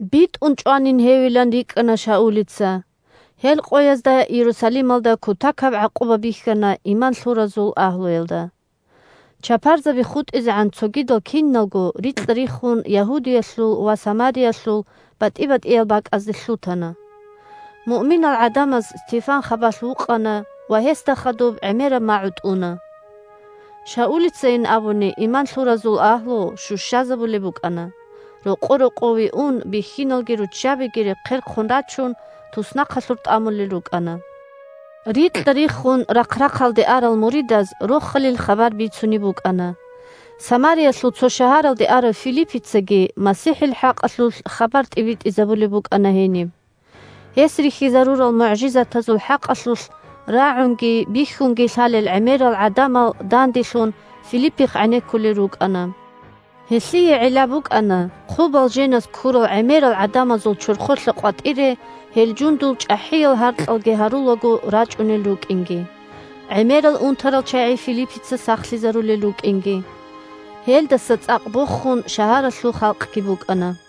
БитӀун чӀванин гьевилан рикӀкӀана Шаулица. Гьел къоязда Иерусалималда кутакаб гӀакъуба бихьана иман лъуразул агьлуялда. Чапарзаби хутӀизегӀан цогидал киналго рикьа-риххун Ягьудиялъул ва Самариялъул батӀи-батӀиял бакӀазде лъутана. Муъминал гӀадамаз Стефан хабалъ вукъана ва гьесда хадуб гӀемераб магӀу тӀуна. Шаулицайин абуни иман лъуразул агьлу щущазабулеб букӀана: рокъо-рокъове ун бихьиналги руччабиги, рехъерхъун рачун, туснахъалъур тӀамулел рукӀана. Рикьа-риххун рахъ-рахъалде арал муридаз Рохалил хабар бицунеб букӀана. Самариялъул цо шагьаралде арав Филиппицаги МасихӀил хӀакъалъулъ хабар тӀибитӀизабулеб букӀана гьениб. Гьес рихьизарурал мугӀжизатазул хӀакъалъулъ рагӀунги бихьунги лъалел гӀемерал гӀадамал данделъун, Филиппихъ гӀенеккулел рукӀана. Гьелъие гӀилла букӀана хъубал женаз ккурал гӀемерал гӀадамазул чорхолъа къватӀире гьел жундул чӀахӀиял гьаркьалги гьарулаго рачӀунел рукӀинги, гӀемерал унтарал чагӀи Филиппица сахлъизарулел рукӀинги. Гьелдаса цӀакъ бохун шагьаралъул халкъги букӀана.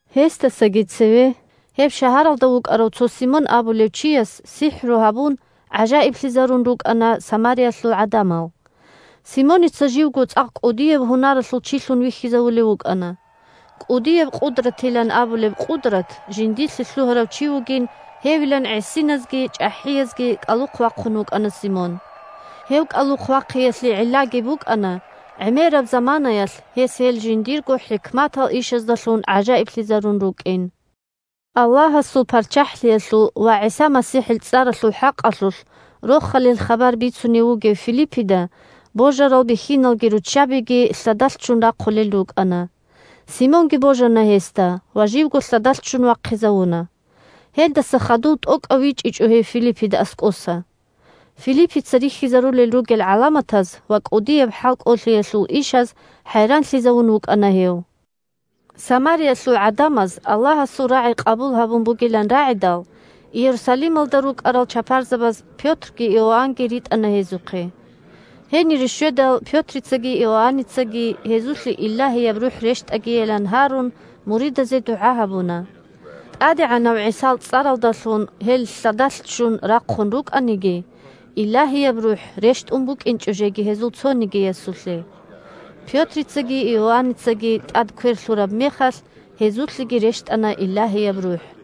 Гьесдасаги цеве гьеб шагьаралда вукӀарав цо Симон абулев чияс сихӀру гьабун гӀажаиблъизарун рукӀана Самариялъул гӀадамал. Симоница живго цӀакъ кӀудияб гьунаралъул чилъун вихьизавулев вукӀана. «КӀудияб къудратилан» абулеб къудрат жиндилъе лъугьарав чи вугин гьевилан гӀисиназги чӀахӀиязги кӀалухъ вахъун вукӀана Симон. Гьев кӀалухъ вахъиялъе гӀиллаги букӀана гӀемераб заманаялъ гьес гьел жиндирго хӀикматал ишаздалъун гӀажаиблъизарун рукӀин. Аллагьасул ПарччахӀлъиялъул ва ГӀиса МасихӀил цӀаралъул хӀакъалъулъ Рохалил хабар бицунев вугев Филиппида божарал бихьиналги руччабиги лъадалъ ччун рахъулел рукӀана. Симонги божана гьесда ва живго лъадалъ ччун вахъизавуна. Гьелдаса хадув тӀокӀав вичӀичӀо гьев Филиппида аскӀоса. Филиппица рихьизарулел ругел гӀаламатаз ва кӀудияб хӀалкӀолъиялъул ишаз хӀайранлъизавун вукӀана гьев. Самариялъул гӀадамаз Аллагьасул рагӀи къабул гьабун бугилан рагӀидал, Иерусалималда рукӀарал чапарзабаз Пётрги Иоаннги ритӀана гьезухъе. Гьенире щведал Пётрицаги Иоанницаги гьезулъе Илагьияб РухӀ рещтӀагийилан гьарун, муридазе дугӀа гьабуна. ТӀадегӀанав ГӀисал цӀаралдалъун гьел лъадалъ ччун рахъун рукӀаниги, Илагьияб РухӀ рещтӀун букӀинчӀо жеги гьезул цонигиясулъе. Пётрицаги Иоанницаги тӀад квер лъураб мехалъ гьезулъеги рещтӀана Илагьияб РухӀ.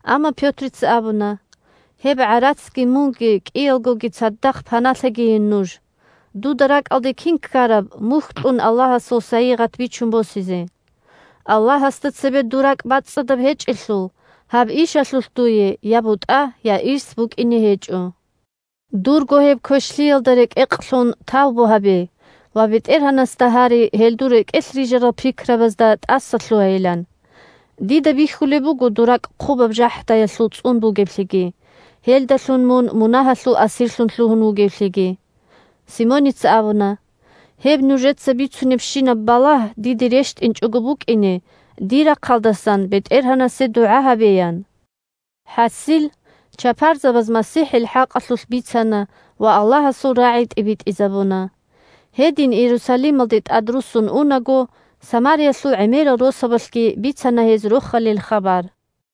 Амма Пётрица абуна: – Гьеб гӀарацги мунги – кӀиялгоги цадахъ – паналъагийин нуж, дуда ракӀалде кин ккараб мухь кьун Аллагьасул сайигъат бичун босизе. Аллагьасда цебе дур ракӀ бацӀцӀадаб гьечӀелъул, гьаб ишалъулъ дуе я бутӀа, я ирс букӀине гьечӀо. Дурго гьеб квешлъиялда рекӀекълъун тавбу гьабе ва БетӀергьанасда гьаре гьел дур рекӀелъ рижарал пикрабазда тӀасалъугьайилан. Дида бихьулеб буго дур ракӀ хъубаб жахӀдаялъул цӀун бугеблъиги, гьелдалъун мун мунагьалъул асирлъун лъугьун вугевлъиги. Симоница абуна: – Гьеб нужеца бицунебщинаб балагь диде рещтӀинчӀого букӀине дир рахъалдасан БетӀергьанасе дугӀа гьабе, – ян. ХӀасил – чапарзабаз МасихӀил хӀакъалъулъ бицана ва Аллагьасул рагӀи тӀибитӀизабуна. Гьедин Иерусалималде тӀадруссун унаго, Самариялъул гӀемерал росабалъги бицана гьез Рохалил хабар.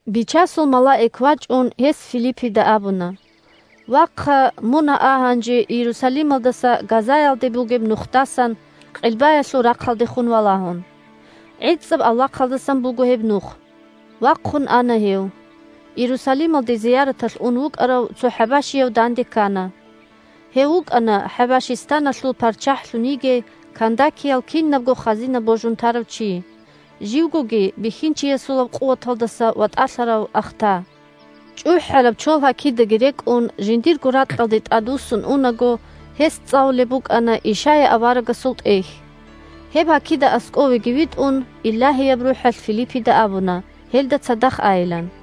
Бичасул малаик вачӀун, гьес Филиппида абуна: – Вахъа, мун а гьанже Иерусалималдаса Газаялде бугеб нухдасан къилбаялъул рахъалдехун валагьун. ГӀицӀаб авлахъалдасан буго гьеб нух. Вахъун ана гьев. Иерусалималде зияраталъ ун вукӀарав цо хӀабашияв данде ккана. Гьев вукӀана ХӀабашистаналъул парччахӀлъун йигей Кандакиял кинабго хазина божун тарав чи, живгоги бихьинчиясулаб къуваталдаса ватӀалъарав ахта. ЧӀухӀараб чолгьакидаги рекӀун, жиндирго ракьалде тӀадвуссун унаго гьес цӀалулеб букӀана Ишая аварагасул тӀехь. Гьеб гьакида аскӀовеги витӀун, Илагьияб РухӀалъ Филиппида абуна гьелда цадахъ айилан.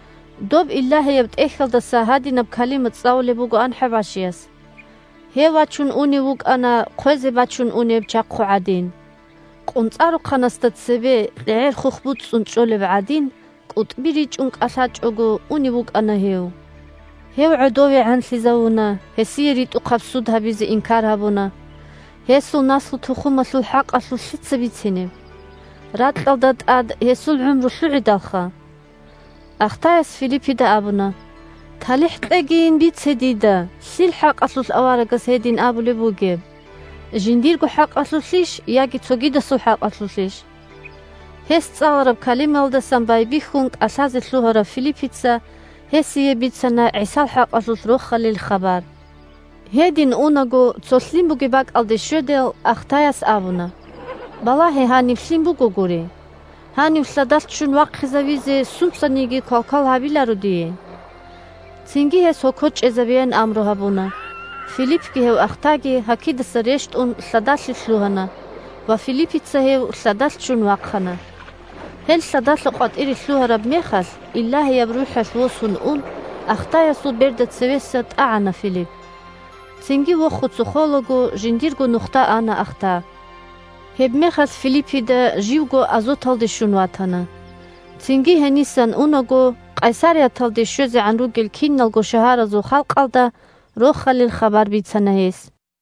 Доб Илагьияб ТӀехьалдаса гьадинаб калима цӀалулеб бугоан хӀабашияс: «Гьев вачун унев вукӀана, хъвезе бачун унеб чахъу гӀадин. КъунцӀарухъанасда цебе кьегӀер-хух буцӀцӀун чӀолеб гӀадин, кӀутӀби ричӀун кӀалъачӀого унев вукӀана гьев. Гьев гӀодовегӀанлъизавуна, гьесие ритӀухъаб суд гьабизе инкар гьабуна. Гьесул наслу-тухумалъул хӀакъалъулъ лъица бицинеб? Ракьалда тӀад гьесул гӀумру лъугӀидалха». Ахтаяс Филиппида абуна: – ТалихӀ кьегийин, бице дида: лъил хӀакъалъулъ аварагас гьедин абулеб бугеб? Жиндирго хӀакъалъулъищ яги цогидасул хӀакъалъулъищ? Гьес цӀалараб калимаялдасан байбихьун кӀалъазе лъугьарав Филиппица гьесие бицана ГӀисал хӀакъалъулъ Рохалил хабар. Гьедин унаго цо лъим бугеб бакӀалде щведал, ахтаяс абуна: – Балагье гьаниб лъим бугогури. Гьанив лъадалъ ччун вахъизавизе сунцаниги квалквал гьабиларо дие? Цинги гьес гьоко чӀезабеян амру гьабуна. Филиппги гьев ахтаги, гьакидаса рещтӀун, лъадалъе лъугьана ва Филиппица гьев лъадалъ ччун вахъана. Гьел лъадалъа къватӀире лъугьараб мехалъ, Илагьияб РухӀалъ восун ун, ахтаясул берда цевеса тӀагӀана Филипп. Цинги вохуца холаго жиндирго нухда ана ахта. Гьебмехалъ Филиппида живго Азоталде щун ватана. Цинги гьенисан унаго Къайсарияталде щвезегӀан ругел киналго шагьаразул халкъалда Рохалил хабар бицана гьес.